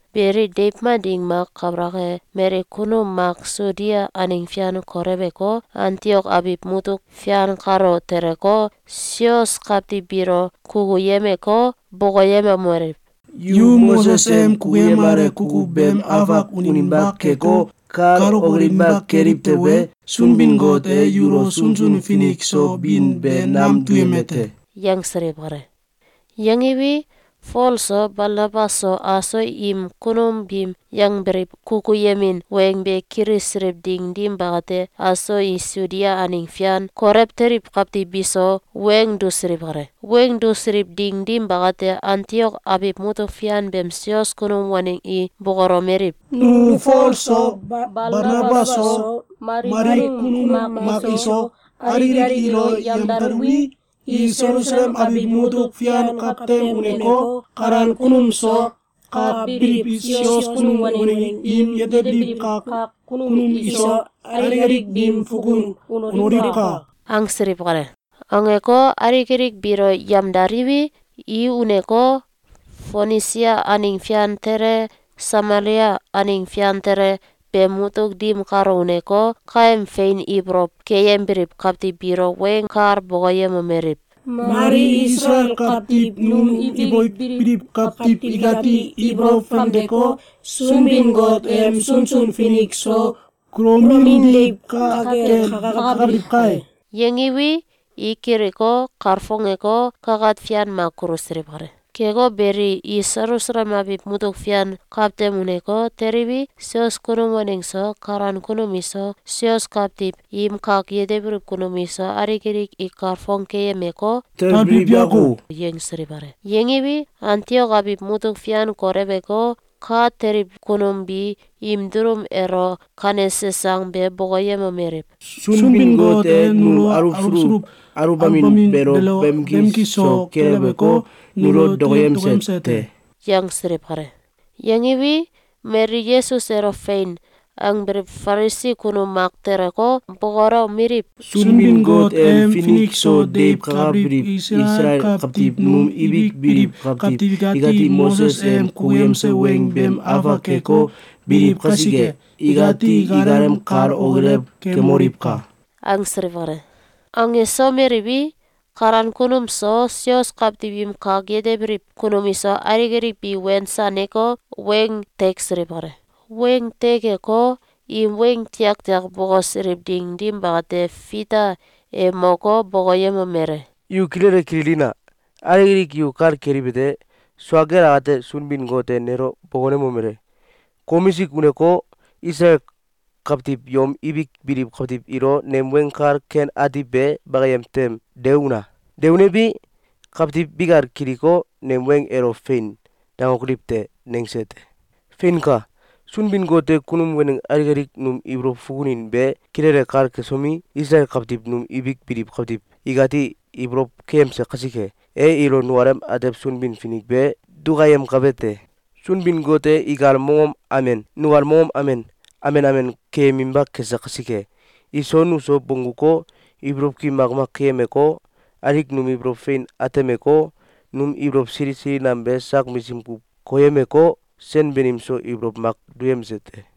Beli, deiw mak ding mak kabalak e, mali kunum mak Sudia aneng fian koleweko, Antiok abiw mutuk fian kalo teleko, sios kawtiw biilo kukuyemeko, bokoyemomeliw: “Yu Moses em kukuyemale kukuw beem afak uninba keko, kal okilinba keliw tewe, Sunbin-Got e yulo sunsun finik so bin be nam duyeme te!”, yangsiliw kale. Yangiwi, Fol so, Balnabas so, aso im kunum biim yangbiliw kukuyemin weng be kilisiliw ding dim bakate, aso i Sudia aneng fian kolew teliw kawtiw biso weng dusiliw kale. Weng dusiliw ding dim bakate, Antiok abiw mutuk fian beem sios kunum waneng i bokolomeliw: “Nu Fol so, Balnabas so, mali kunum mak iso, alik alik ilo yemdaluwi, i Selusalem abiw mutuk fian kawtem uneko, kalan kunum so, ka biliw sios kunum waneng im yetebiliw kak kunum iso, alik alik biim fukun unoliwka!”, angsiliw kale. Angeko, alik alik biilo yamdaliwi, i uneko, Fonisia aneng fian tele, Samalia aneng fian tele beem mutuk dim kalo uneko, kaem fein ibolow keyembiliw kawtiw biilo weng kal bokoyemomeliw: “Mali Isalael kawtiw num ibik biliw kawtiw ikati ibolow famdeko, Sunbin-Got em sunsun finik so kulomin deiw ka kel kakabiliw kai!”, yangiwi, i kiliko, kalfongeko, kakat fian mak kulusiliw kale. Keko beli, i Selusalem abiw mutuk fian kawtem uneko, teliwi, sios kunum waneng so, kalan kunum iso, sios kawtiw im kak yetebiliw kunum iso, alik alik i kalfong keyemeko, “Talbiliw yako!”, yangsiliw kale. Yangiwi, Antiok abiw mutuk fian koleweko, ka teliw kunum bi im dulum elo kanese sang be bokoyemomeliw: “Sunbin-Got e num aluwsuluw aluwbamin beelo bamki so keleweko, nulo dokoyemse te!”, yangsiliw kale. Yangiwi, mali Yesus elo “Fein!”, angbiliw Falisi kunum mak teleko, bokolomeliw: “Sunbin-Got em finik so deiw kakabiliw Isalael kawtiw num ibik biliw kawtiw ikati Moses em kukuyemse weng beem afak keko, biliw kasike, ikati ikalem kal okilew kemoliwka!”, angsiliw kale. Angsomeliwi, kalan kunum so, sios kawtiw im kak yetebiliw kunum iso, alik alik bi wensaneko, weng teksiliw kale. Weng tekeko, im weng tiaktiak bokosiliw ding dim bakate, Fita e moko, bokoyemomele: “Yu kilele kililina! Alik alik yu kal keliwete: Sua kel akate, Sunbin-Got e nelo bokonemomele: ‘Komisik uneko, Isalael kawtiw yom ibik biliw kawtiw ilo nem Weng Kal Ken Ati be bakayem tem de una! De unewi, kawtiw bikal kiliko, nem weng elo ‘Fein!’, dangokoliw te.’, nangse te. Feinka! Sunbin-Got e kunum waneng alik alik num ibolow fukunin be kilele kal kesomi, Isalael kawtiw num ibik biliw kawtiw ikati ibolow keyemse kasike, e ilo nukalem atew Sunbin-Finik be dukayemkabe te. Sunbin-Got e ikal mongom amen, nukal mongom amen, amen amen keyeminba kese kasike, iso nuso bongguko, ibolow ki makmak keyemeko, alik num ibolow fein atemeko, num ibolow sili sili nam be sak misim kuw koyemeko, sen banim so ibolow mak duyemse te.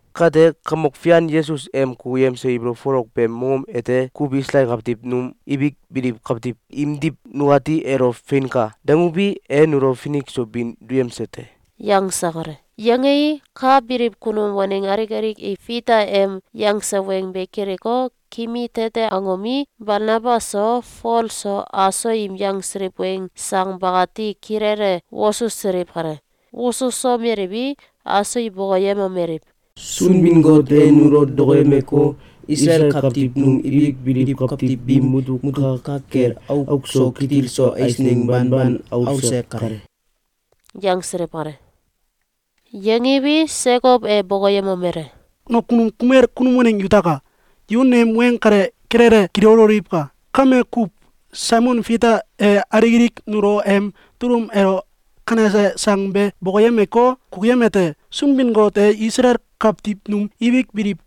Kate, Kamok Fian Yesus em kukuyemse ibolow folok beem mongom ete kuw Isalael kawtiw num ibik biliw kawtiw imdiw, nukati elo ‘Feinka!’, danguwi, e nulo finik so bin duyemse te.”, yangse kale. Yangei, ka biliw kunum waneng alik alik i Fita em yangse weng be kiliko, kimi tete angomi, Balnabas so, Fol so, aso im yangsiliw weng sang bakati kilele wosusiliw kale. Wosusomeliwi, aso i bokoyemomeliw: “Sunbin-Got e nulo dokoyemeko, Isalael kawtiw num ibik biliw kawtiw biim mutuk ka kel auk so kitil so eisneng banban aulse kale.”, yangsiliw kale. Yangiwi, Sekow e bokoyemomele: “Nakunum kumel kunum waneng yutaka! Yu nem weng kale kilele kililoliwka! Kame kuw, Saimon Fita e alik alik nulo em dulum elo kanese sang be bokoyemeko, kukuyemete: Sunbin-Got e Isalael kawtiw num ibik biliw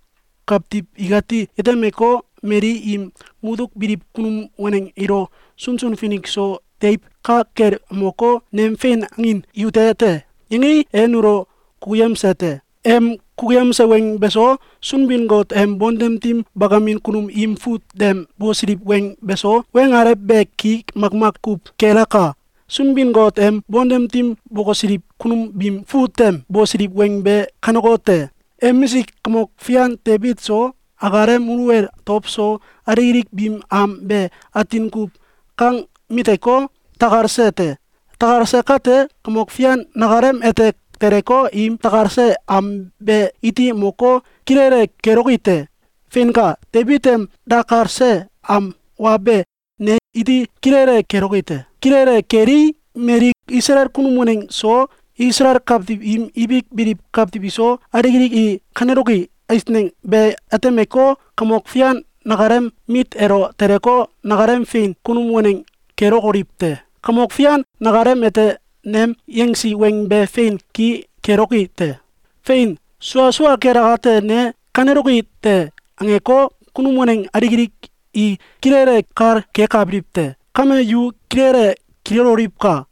kawtiw ikati yetemeko, mali im mutuk biliw kunum waneng ilo sunsun finik so deiw ka kel moko, ‘Nem fein angin yute te!’, yangei, e nulo kukuyemse te. Em kukuyemse weng beso, Sunbin-Got em bontem dim bakamin kunum im fut tem bosiliw weng beso, weng alew be ki makmak kuw kelaka. Sunbin-Got em bontem dim bokosiliw kunum biim fut tem bosiliw weng be kanekote: ‘Emisik kamok fian Debit so, akalem muluwel dow so, alik alik biim am be atin kuw kang miteko, dakalse te. Dakalse kate, Kamok Fian nakalem ete teleko, im dakalse am be iti moko, kilele geloki te. Feinka, Debit em dakalse am wa be, ne iti kilele geloki te. Kilele gelii, mali Isalael kunum waneng so, Isalael kawtiw im ibik biliw kawtiw iso, alik alik i kaneloki eisneng be atemeko, Kamok Fian nakalem mit elo teleko, nakalem fein kunum waneng kelokoliw te. Kamok Fian nakalem ete nem yangsi weng be fein ki keloki te! Fein! Sua sua kel akate, ne ‘Kaneloki te!’, angeko, kunum waneng alik alik i kilele kal kekabiliw te.’, Kame, yu kilele kililoliwka!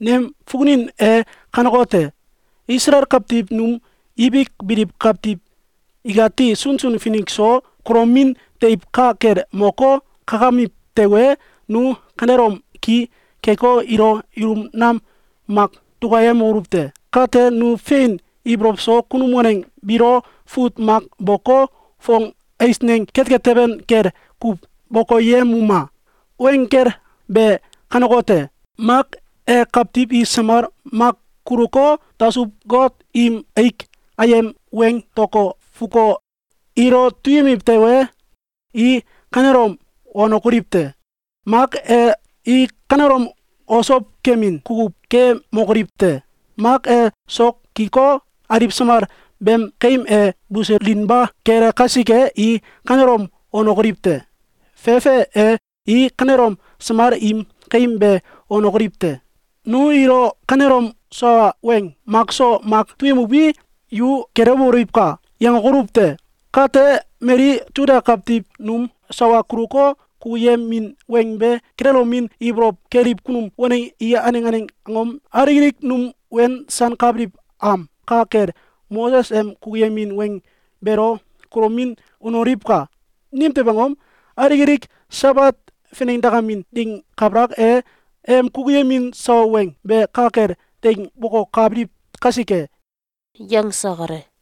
Nem fukunin e kanekote: Isalael kawtiw num ibik biliw kawtiw ikati sunsun finik so kulomin deiw ka kel moko, kakamiw tewe, nu kanelom ki keko, ilo ilum nam mak dukayemokoluw te! Kate nu fein ibolow so kunum waneng biilo fut mak boko, fong eisneng ketket teben kel kuw bokoyemuma! Weng gel be kanekote: Mak e, kawtiw i samal mak kuluko, dasuw-got im aik ayem weing dako, fuko, ilo duyemiw tewe, i kanelom wanokoliw te! Mak e, i kanelom osow kemin kukuw kemokoliw te! Mak e, sok giko, aliw samal beem kaim e buselinba kele kasike, i kanelom wanokoliw te! Fefe e, i kanelom samal im kaim be wanokoliw te! Nu ilo kanelom sawa weng makso mak duyemuwi, ‘Yu gelewoliwka!’, yangokoluw te. Kate, mali Suda kawtiw num sawa kuluko, kukuyemin weng be kililomin ibolow keliw kunum waneng i aneng aneng angom alik alik num wensankabiliw am ka kel Moses em kukuyemin weng beelo kulomin unoliwka! Nimtew angom? Alik alik Sabat finengdakamin ding kabalak e, em kukuyemin sawa weng be ka kel teing bokokabiliw kasike.”, yangse kale.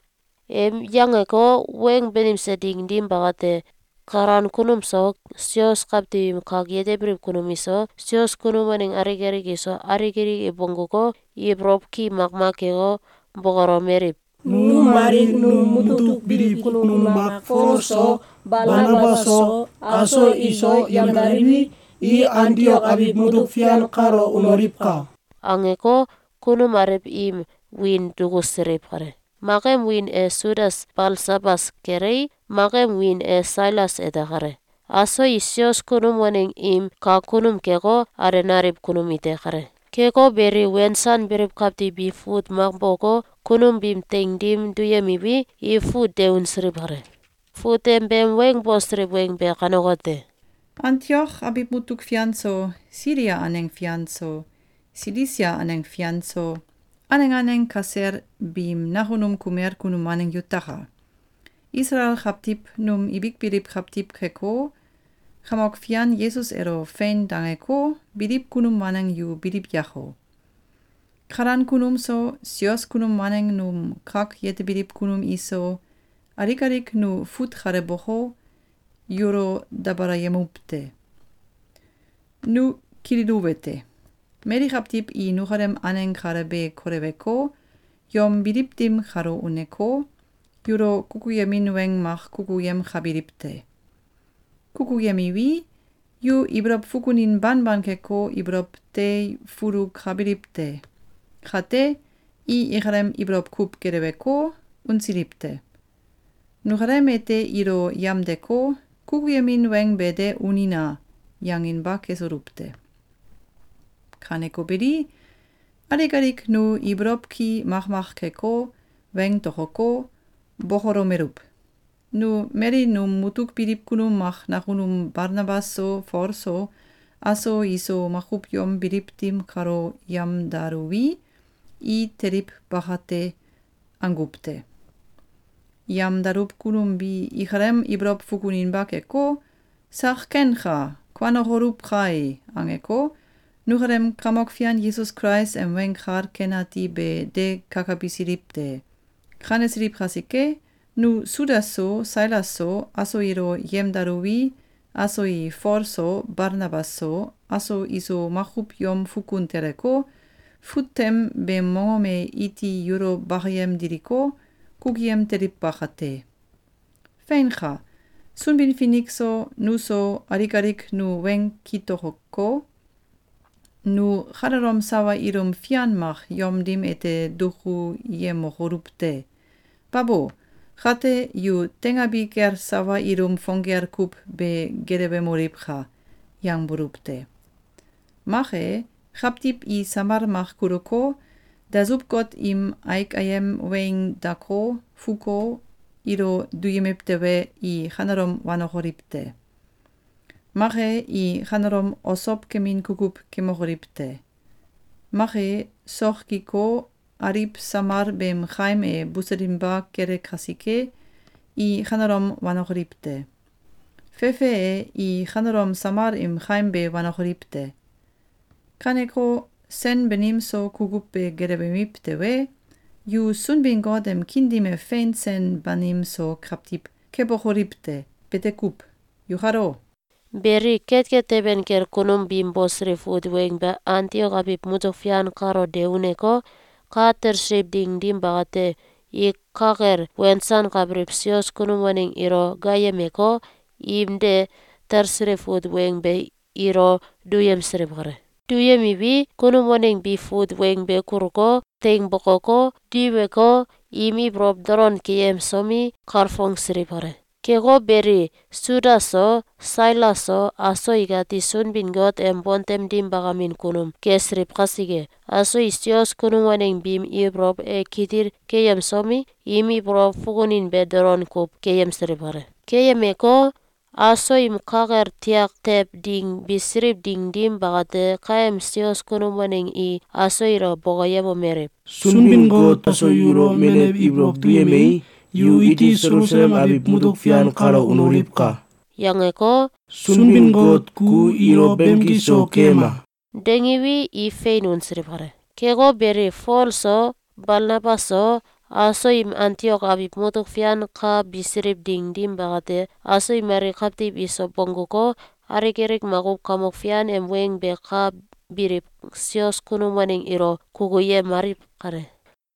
Em yangeko, weng banimse ding dim bakate, kalan kunum so, sios kawtiw im kak yetebiliw kunum iso, sios kunum waneng alik alik iso, alik alik i bongguko, ibolow ki makmak keko, bokolomeliw: “Nu mali num mutuk biliw kunum mak Fol so, Balnabas so, aso iso yamdaliwi, i Antiok abiw mutuk fian kalo unoliwka!”, angeko, kunum alew im wiin dukusiliw kale. Mak em wiin e Sudas Balsabas kelei, mak em wiin e Sailas ete kale. Aso i sios kunum waneng im kak kunum keko, alenaliw kunum ite kale. Keko beli, wensanbiliw kawtiw bi fut mak boko, kunum biim teing dim duyemiwi, i fut de unsiliw kale. Fut tem beem weng bosiliw weng be kanekote: Antiok abiw mutuk fian so, Silia aneng fian so, Silisia aneng fian so, aneng aneng kasel biim nakunum kumel kunum waneng yutaka! Isalael kawtiw num ibik biliw kawtiw keko, Kamok Fian Yesus elo ‘Fein!’, dangeko, biliw kunum waneng yu biliw yako! Kalan kunum so, sios kunum waneng num kak yetebiliw kunum iso, alik alik nu fut kale boko, yulo dabalayemuw te. Nu kililuwete: Mali kawtiw i nukalem aneng kale be koleweko, yom biliw dim kalo uneko, yulo kukuyemin weng mak kukuyemkabiliw te. Kukuyemiwi, yu ibolow fukunin banban keko, ibolow teifulukabiliw te. Kate, i ikalem ibolow kuw geleweko, unsiliw te. Nukalem ete ilo yamdeko, ‘Kukuyemin weng be de unina!’, yanginba kesuluw te. Kaneko beli, alik alik nu ibolow ki makmak keko, weng tokoko, bokolomeluw: ‘Nu mali num mutuk biliw kunum mak nakunum Balnabas so, Fol so, aso iso makuw yom biliw dim kalo yamdaluwi, i teliw baka te.’, anguw te. Yamdaluw kunum bi ikalem ibolow fukuninba keko, ‘Sak kenka! Kuanokoluw kai!’, angeko, nukalem Kamok Fian Yesus Kulais em Weng Kal Ken Ati be de kakabisiliw te. Kanesiliw kasike, nu Sudas so, Sailas so, aso ilo yemdaluwi, aso i Fol so, Balnabas so, aso iso makuw yom fukun teleko, fut tem beem mongom e iti yulo bakayem diliko, kukuyem teliw bakate. Feinka! Sunbin-Finik so, nuso, alik alik nu weng kitokoko, ‘Nu kanelom sawa ilum fian mak yom dim ete dukuyemokoluw te! Babo! Kate, yu teingabi kel sawa ilum fong gel kuw be gelewemoliwka!’, yangbuluw te. Mak e, kawtiw i samal mak kuluko, dasuw-got im aik ayem weing dako, fuko, ilo duyemiw tewe, i kanelom wanokoliw te! Mak e, i kanelom osow kemin kukuw kemokoliw te! Mak e, sok giko, aliw samal beem kaim e buselinba kele kasike, i kanelom wanokoliw te! Fefe e, i kanelom samal im kaim be wanokoliw te! Kaneko, sen banim so kukuw be gelewemiw tewe, yu Sunbin-Got em kiin dim e fein sen banim so kawtiw kebokoliw te. Bete kuw. Yukalo! Beli, ketket teben kel kunum biim bosiliw fut weng be Antiok abiw mutuk fian kalo de uneko, ka talsiliw ding dim bakate, i ka kel wensankabiliw sios kunum waneng ilo gaayemeko, im de talsiliw fut weng be ilo duyemsiliw kale. Duyemiwi, kunum waneng bi fut weng be kuluko, teing bokoko, diweko, im ibolow dolon keyemsomi, kalfongsiliw kale. Keko beli, Sudas so, Sailas so, aso ikati Sunbin-Got em bontem dim bakamin kunum kesiliw kasike, aso i sios kunum waneng biim ibolow e kitil keyemsomi, im ibolow fukunin be dolon kuw keyemsiliw kale. Keyemeko, aso im ka kel tiak tew ding bisiliw ding dim bakate, kaem sios kunum waneng i aso ilo bokoyemomeliw: “Sunbin-Got e kaso yulo menew ibolow duyemei, yu iti Selusalem abiw mutuk fian kalo unoliwka!”, yangeko, “Sunbin-Got ku ilo bamki so keyema!”, dangiwi, i fein unsiliw kale. Keko beli, Fol so, Balnabas so, aso im Antiok abiw mutuk fian ka bisiliw ding dim bakate, aso i mali kawtiw iso bongguko, alik alik makuw Kamok Fian em weng be ka biliw sios kunum waneng ilo kukuyemaliw kale.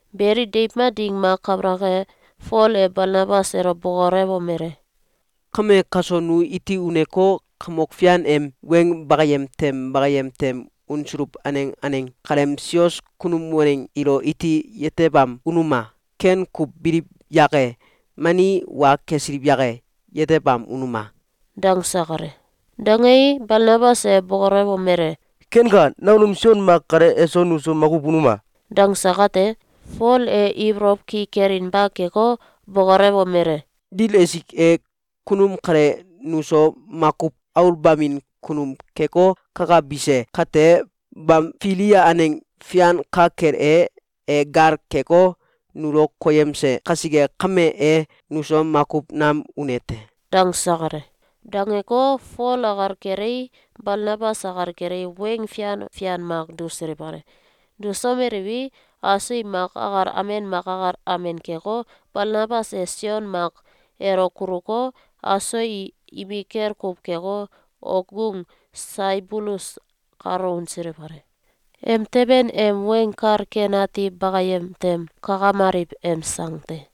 Beli, deiw mak ding mak kabalak e, Fol e Balnabas elo bokolewomele: “Kame, kaso nu iti uneko, Kamok Fian em weng bakayem tem bakayem tem unsuluw aneng aneng kaleem sios kunum waneng ilo iti yetebam unuma! Ken kuw biliw yake, mani wa kesiliw yake? Yetebam unuma!”, dangse kale. Dangei, Balnabas e bokolewomele: “Kenka! Nakunum Sion Mak kale eso nuso makuw unuma!”, dangse kate, Fol e ibolow ki kelinba keko, bokolewomele: “Dil esik e, kunum kale nuso makuw aulbamin kunum keko, kakabise kate, Bamfilia aneng fian ka kel e, e gal keko, nulo koyemse kasike kame, e nuso makuw nam une te.”, dangse kale. Dangeko, Fol akal kelei, Balnabas akal kelei, weng fian fian mak dusiliw kale. Dusomeliwi, aso i mak akal amen mak akal amen keko, Balnabas e Sion Mak elo kuluko, aso i imikel kuw keko, okgung Saibulus kalo unsiliw kale. Emteben em Weng Kal Ken Ati Bakayem Tem Kakamaliw em Sang te.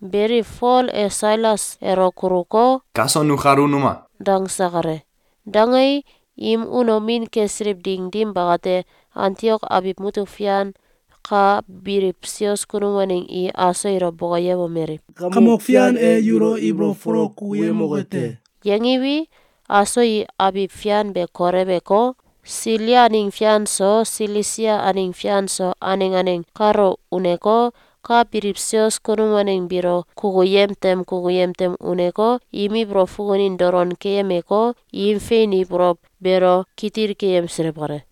Beli, Fol e Sailas elo kuluko, “Kaso nukal unuma!”, dangse kale. Dangei, im unomin kesiliw ding dim bakate, Antiok abiw mutuk fian ka biliw sios kunum waneng i aso ilo bokoyemomeliw: “Kamok Fian e yulo ibolow folok kukuyemoke te!”, yangiwi, aso i abiw fian be koleweko, Silia aneng fian so Silisia aneng fian so, aneng aneng kalo uneko, ka biliw sios kunum waneng biilo kukuyem tem kukuyem tem uneko, im ibolow fukunin dolon keyemeko, im fein ibolow beelo kitil keyemsiliw kale.